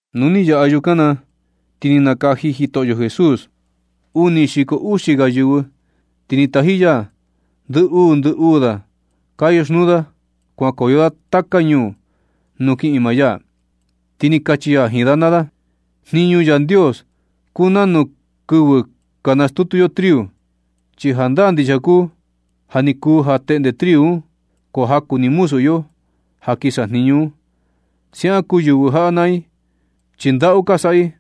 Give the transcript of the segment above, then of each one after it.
Nu ni yaꞌa yukan na ti ni nakaji Jitoꞌyo Jesús uni xiko uxi ga yɨvɨ, ti ni taji ya ndɨ uu ndɨ uu da ka yoxnuu da kuankoyo da taka ñuu nuu kiꞌin maa ya, ti ni kachi ya jiin da naa da: ―Jniñu Yandios kuu nanu kɨvɨ ka nastutu yo triu, chi jandaa ndixia kuu ja, ja ni kuu ja teꞌnde triu un, ko jaku ni muzu iyo ja kin sajniñu un. Siaꞌan kuu yɨvɨ jaꞌa naa i, chi ndaꞌu ka saꞌa i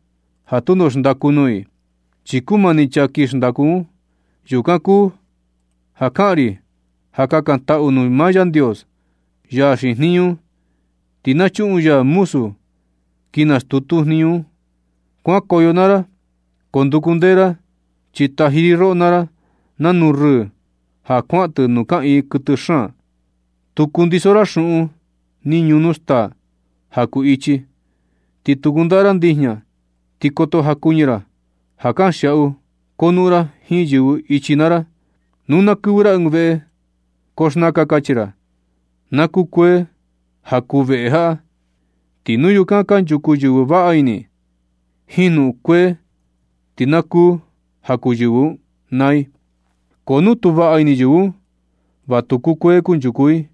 ja tundo xndaku nuu i, chi kumani chaa kin xndaku un. Yukan kuu ja kaꞌan ri ja kakantaꞌu nuu maa Yandios, ya xiin jniñu un, ti na chuꞌun ya muzu kin nastutu jniñu un. Kuankoyo naa ra, ko nduku ndee ra, chi taji ri roꞌo naa ra nanu rɨɨ ja kuaꞌan tɨ nuu kaꞌiin kuɨtɨ xaan. Tu kundiso ra xuꞌun ni ñunu staa ja kuu ichi, ti tu kundaꞌa ra ndijña, ti koto jakuñɨ ra ja kanxiaꞌu konuꞌun ra jiin yɨvɨ ichi naa ra. Nu ka kɨvɨ ra ɨɨn veꞌe ko xnaka kachi ra: “Na kukuee ja kuu veꞌe jaꞌa.” Ti nu yukan kanchuku yɨvɨ vaꞌa ini, jiin jnuꞌun kukuee, ti na kuu ja kuu yɨvɨ un naa i. Ko nu tu vaꞌa ini yɨvɨ un, va tu kukuee kanchuku i.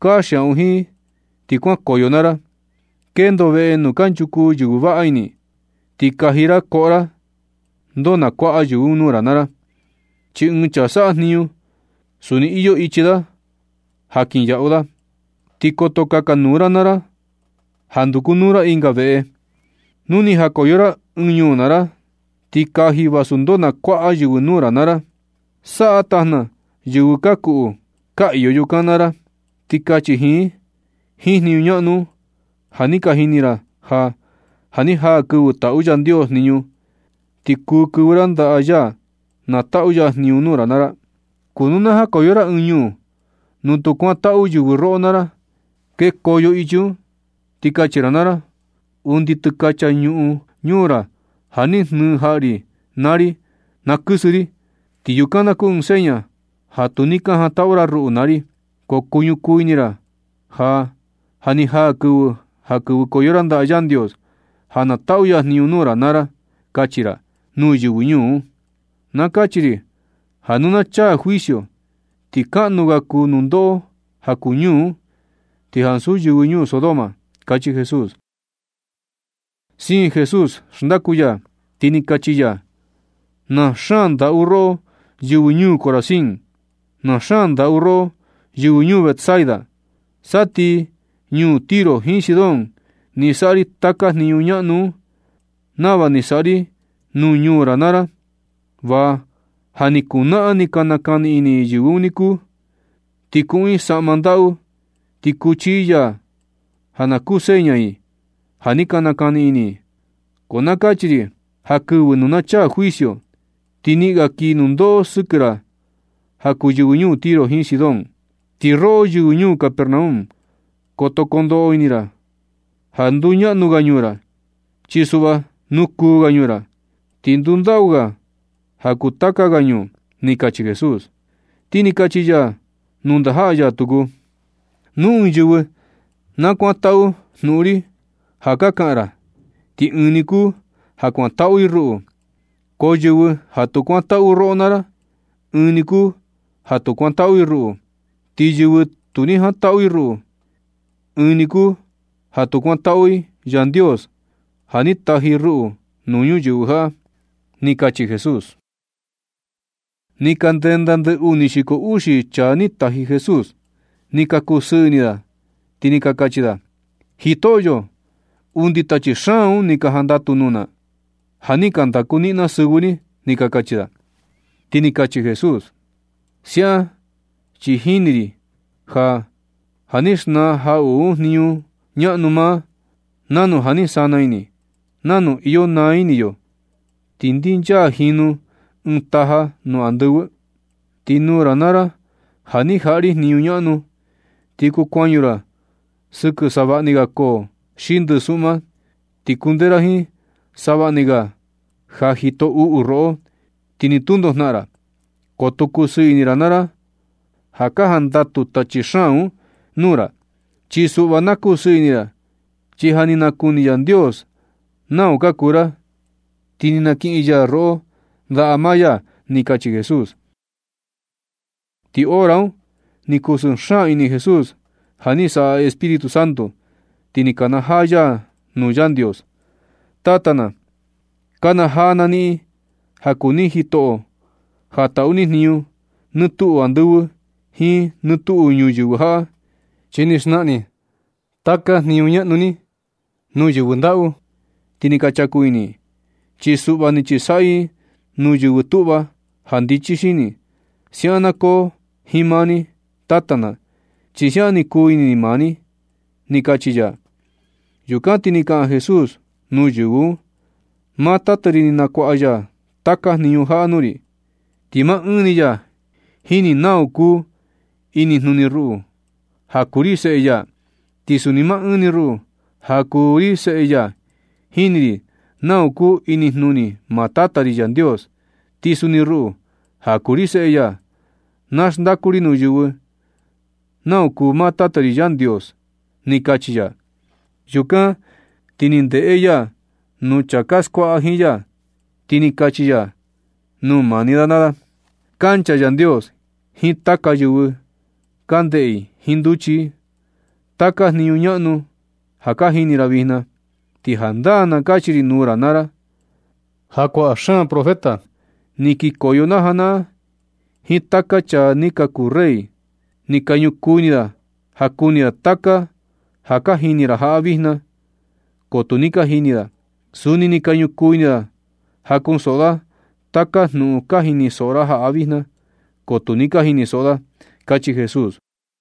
Kanxiaꞌu jiin i ti kuankoyo naa ra. Kendo veꞌe nuu kanchuku yɨvɨ vaꞌa ini, ti kaji ra koꞌo ra ndoo na kuaꞌa yɨvɨ un nuu ra naa ra, chi ɨɨn chaa saꞌa jniñu, suni iyo ichi da ja kinyaꞌu da. Ti koto kakanuu ra naa ra ja ndukunuu ra ɨnga veꞌe. Nu ni jakoyo ra ɨɨn ñuu naa ra, ti kaji vasu ndoo na kuaꞌa yɨvɨ nuu ra naa ra. Saꞌa tajna yɨvɨ ka kuꞌu ka iyo yukan naa ra, ti kachi jiin i: “Jiin jniñu ñaꞌnu un ja ni ka jini ra ja, ja ni jaa kɨvɨ taꞌu Yandios jniñu, ti kuu kɨvɨ ra ndaꞌa ya na taꞌu ya jniñu nuu ra naa ra.” Ko nu na jakoyo ra ɨɨn ñuu nuu tu kuantaꞌu yɨvɨ roꞌo naa ra, kekoyo ichi un, ti kachi naa ra: “Undi tɨkacha ñuꞌun ñuu ra ja ni jnɨɨ jaꞌa ri naa ri, na kɨsɨ ri, ti yukan na kuu seña ja tu ni ka jantaꞌu ra ruꞌu naa ri. Ko kuñukuu ini ra ja, ja ni jaa kɨvɨ ja kɨvɨkoyo ra ndaꞌa Yandios ja na taꞌu ya jniñu nuu ra naa ra”, kachi ra nuu yɨvɨ ñuu un. Na kachi ri ja nu na chaa juicio, ti kaꞌnu ga kuu nundoꞌo ja kuu ñuu un, ti ansu yɨvɨ ñuu Sodoma ―kachi Jesús. Siin Jesús xndaku ya, ti ni kachi ya: ―¡Na xaan ndaꞌu roꞌo yɨvɨ ñuu Corazín! ¡Na xaan ndaꞌu roꞌo yɨvɨ ñuu Betsaida! Sa ti ñuu Tiro jiin Sidón ni saꞌa ri taka jniñu ñaꞌnu un nava ni saꞌa ri nuu ñuu ra naa ra, va ja ni kuu naꞌan ni ka nakani ini yɨvɨ un niku, ti kuꞌun i saꞌma ndaꞌu, ti kuchi i yaa, ja na kuu seña i ja ni ka nakani ini i. Ko na kachi ri ja kɨvɨ nu na chaa juicio, ti niꞌin ga kii nundoꞌo sɨkɨ ra ja kuu yɨvɨ ñuu Tiro jiin Sidón. Ti roꞌo, yɨvɨ ñuu Capernaum, koto ndoꞌo ini ra ja nduñaꞌnu ga ñuu ra. Chi suꞌva nukuu ga ñuu ra, ti ndundaꞌu ga ja kuu taka ga ñuu ―ni kachi Jesús. Ti ni kachi ya nuu ndajaꞌa ya tuku: ―Nu ɨɨn yɨvɨ na kuantaꞌu jnuꞌun ri ja ka kaꞌan ra, ti ɨɨn ni kuu ja kuantaꞌu i ruꞌu. Ko yɨvɨ ja tu kuantaꞌu roꞌo naa ra, ɨɨn ni kuu ja tu kuantaꞌu i ruꞌu. Ti yɨvɨ tu ni jantaꞌu i ruꞌu, ɨɨn ni kuu ja tu kuantaꞌu i Yandios ja ni taji ruꞌu nuu ñuyɨvɨ jaꞌa ―ni kachi Jesús. Ni ka ndenda ndɨ uni xiko uxi chaa ni taji Jesús. Ni ka kusɨɨ ini da, ti ni ka kachi da: ―Jitoꞌyo, undi tachi xaan un ni ka jandatu nuu na, ja ni ka ndaku niꞌin na sɨvɨ ni ―ni ka kachi da. Ti ni kachi Jesús: ―Siaꞌan chi jini ri ja, ja ni xnaa jaꞌuꞌu un jniñu ñaꞌnu maa, nanu ja ni sana ini, nanu iyo naa ini yo ti ndinchaa jinu ɨɨn taja nuu andɨvɨ. Ti nuu ra naa ra ja ni jaꞌa ri jniñu ñaꞌnu, ti kuu kuañu ra sɨkɨ savaꞌni ga koo xi ndɨsuꞌma, ti kundee ra jiin savaꞌni ga ja jito uꞌu roꞌo, ti ni tundo jnaꞌan ra. Ko tu kusɨɨ ini ra naa ra ja ka jandatu tachi xaan un nuu ra. Chi suꞌva na kusɨɨ ini ra, chi ja ni nakuni Yandios nau ka kuu ra, ti ni nakiꞌin ya roꞌo ndaꞌa maa ya ―ni kachi Jesús. Ti hora un ni kusɨɨ xaan ini Jesús ja ni saꞌa Espíritu Santo, ti ni kanajaa ya nuu Yandios: ―Tata na, nakanajaa na niꞌin ja kuu ni jitoꞌo ja taꞌu ni jniñu nɨ tuꞌu andɨvɨ jiin nɨ tuꞌu ñuyɨvɨ jaꞌa, chi ni xnaꞌan ni taka jniñu ñaꞌnu ni nuu yɨvɨ ndaꞌu, ti ni ka chaku ini i. Chi suꞌva ni chisaꞌyɨ ni nuu yɨvɨ tuꞌva ja ndichi xini. Siaꞌan na koo jiin maa ni, Tata na, chi siaꞌan ni kuu ini maa ni ―ni kachi ya. Yukan ti ni kaꞌan Jesús nuu yɨvɨ un: ―Maa tata ri ni nakuaꞌa ya taka jniñu jaꞌa nuu ri. Ti maa ɨɨn ni ya jini nau kuu inijnuni ruꞌu ja kuu ri seꞌe ya. Ti suni ma ɨɨn ni ruꞌu ja kuu ri seꞌe ya, jini ri nau kuu inijnuni maa Tata ri Yandios. Ti suni ruꞌu, ja kuu ri seꞌe ya, na xndaku ri nuu yɨvɨ nau kuu maa Tata ri Yandios ―ni kachi ya. Yukan na ti ni ndeꞌe ya nuu chaa ka skuaꞌa jiin ya, ti ni kachi ya nuu maa ni da naa da: ―Kancha Yandios jiin taka yɨvɨ ka ndeꞌe i jiin nduchi i taka jniñu ñaꞌnu ja ka jini ra vijna. Ti jandaa na kachi ri nuu ra naa ra, ja kuaꞌa xaan profeta ni kikoyo na janaꞌan, jiin taka chaa ni ka kuu rey, ni ka ñukuu ini da ja kuni da taka ja ka jini ra jaꞌa vijna, ko tu ni ka jini da. Suni ni ka ñukuu ini da ja kunsoꞌo da taka jnuꞌun ka jinisoꞌo ra jaꞌa vijna, ko tu ni ka jinisoꞌo da ―kachi Jesús.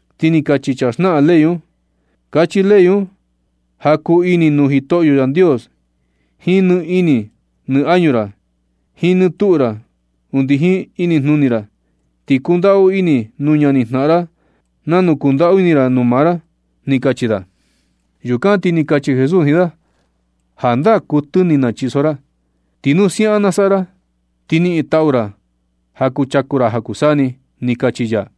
Ti ni kachi chaa xnaꞌan ley un: ―Kachi ley un ja kuu ini nuu Jitoꞌyo Yandios jiin ni ini ni añu ra, jiin nɨ tuꞌu ra, undi jiin inijnuni ra, ti kundaꞌu ini nuu ñanijnaꞌan ra nanu kundaꞌu ini ra nuu maa ra ―ni kachi da. Yukan na ti ni kachi Jesús jiin da: ―Jandaa kuɨtɨ ni nachiso ra. Ti nu siaꞌan na saꞌa ra, ti niꞌin taꞌu ra ja kuchaku ra ja kuu saa ni ―ni kachi ya.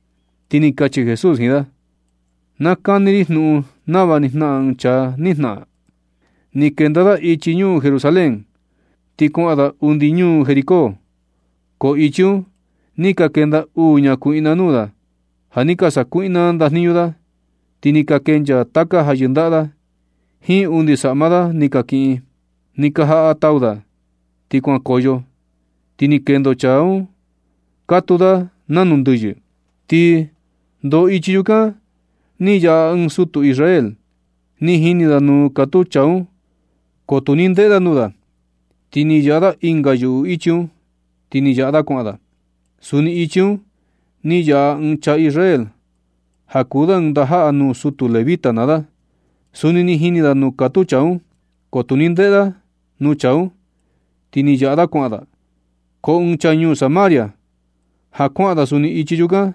Ti ni kachi Jesús jiin da: ―Na kani ri jnuꞌun nava ni jnaꞌan ɨɨn chaa ni jnaꞌan. Ni kenda da ichi ñuu Jerusalén, ti kuaꞌan da undi ñuu Jericó. Ko ichi un ni ka kenda uu ñakuiꞌna nuu da ja ni ka sakuiꞌna ndajniñu da. Ni ka kenchaa taka ja yɨndaꞌa da, jiin undi saꞌma da ni ka kiꞌin. Ni ka jaꞌa tau da, ti kuankoyo, ti ni kendo chaa un katuu da nanu ndɨyɨ. Ti ndo ichi yukan ni yaꞌa ɨɨn sutu Israel. Ni jini da nuu katuu chaa un, ko tu ni veꞌe da nuu da, ti ni yaꞌa da ɨnga yuꞌu ichi un, ti ni yaꞌa da kuaꞌan da. Suni ichi un ni yaꞌa ɨɨn chaa Israel ja kuu da ɨɨn ndajaꞌa nuu sutu levita naa da. Suni ni jini da nuu katuu chaa un, ko tu ni ndeꞌe da nuu chaa un, ti ni yaꞌa da kuaꞌan da. Ko ɨɨn chaa ñuu Samaria, ja kuaꞌan da suni ichi yukan,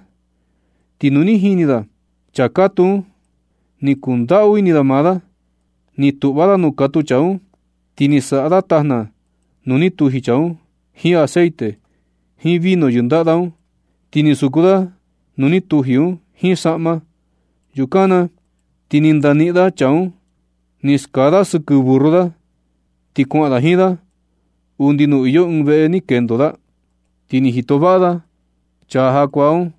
ti nu ni jini da chaa katuu un, ni kundaꞌu ini da maa da. Ni tuꞌva da nuu katuu chaa un, ti ni saꞌa da tajna nuu ni tuji chaa un jiin aceite, jiin vino yɨndaꞌa da un. Ti ni suku da nuu ni tuji un jiin saꞌma. Yukan na ti ni ndaniꞌin da chaa un, ni skaa da chaa sɨkɨ burru da, ti kuaꞌan da jiin da undi nuu iyo ɨɨn veꞌe ni kendo da. Ti ni jito vaꞌa da chaa jakuaa un.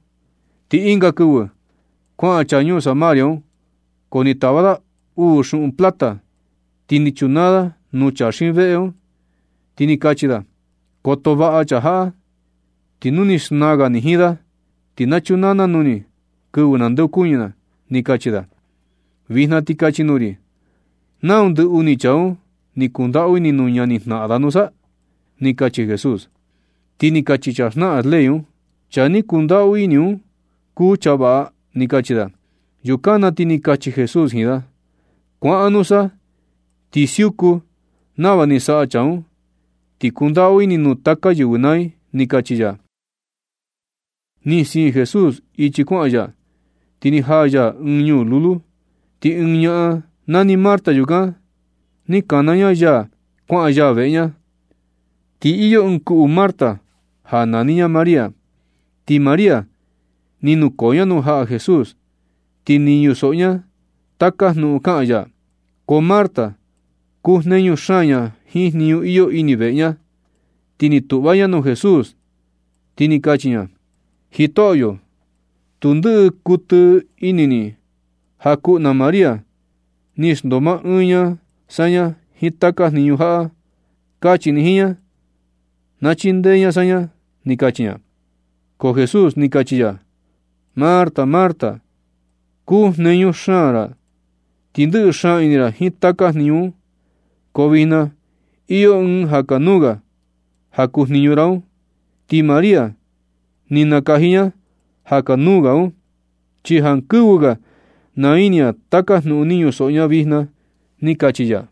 Ti ɨnga kɨvɨ kuaꞌan chaa ñuu Samaria un, ko ni tava da uu xuꞌun plata, ti ni chunaa da nuu chaa xiin veꞌe un, ti ni kachi da: “Koto vaꞌa ni chaa jaꞌa, ti nu ni xnaa ga ni jiin da, ti na chunaa na nuu ni kɨvɨ nandeokuñɨ na”, ni kachi da. Vijna ti kachi nuu ri, ¿nau ndɨ uni chaa un ni kundaꞌu ini nuu ñanijnaꞌan da nusa? ―ni kachi Jesús. Ti ni kachi chaa xnaꞌan ley un: ―Chaa ni kundaꞌu ini un kuu chaa vaꞌa ―ni kachi da. Yukan na ti ni kachi Jesús jiin da: ―Kuaꞌan nusa, ti siuku nava ni saꞌa chaa un, ti kundaꞌu ini nuu taka yɨvɨ naa i ―ni kachi ya. Ti ni siin Jesús ichi kuaꞌan ya, ti ni jaa ya ɨɨn ñuu lulu. Ti ɨɨn ñaꞌan nani Marta yukan, ni kana ña ya kuaꞌan ya veꞌe ña. Ti iyo ɨɨn kuꞌu Marta ja nani ña María, ti María ni nukoo ña nuu jaꞌa Jesús, ti ni ñusoꞌo ña taka jnuꞌun kaꞌan ya. Ko Marta kujneñu xaan ña jiin jniñu iyo ini veꞌe ña. Ti ni tuꞌva ña nuu Jesús, ti ni kachi ña: ―Jitoꞌyo, tu ndɨꞌɨ kuɨtɨ ini ni ja kuꞌu na María, ni xndoo maa ɨɨn ña saña jiin taka jniñu jaꞌa. Kachi ni jiin ña na chindee ña saña ―ni kachi ña. Ko Jesús ni kachi ya: ―¡Marta! ¡Marta! Kujneñu xaan ra ti ndɨꞌɨ xaan ini ra jiin taka jniñu un. Ko vijna iyo ɨɨn ja kanuu ga ja kuu jniñu ra un. Ti María ni nakaji ña ja kanuu ga un. Ti jankɨvɨ ga naa ini ña taka jnuꞌun ni ñusoꞌo ña vijna ―ni kachi ya.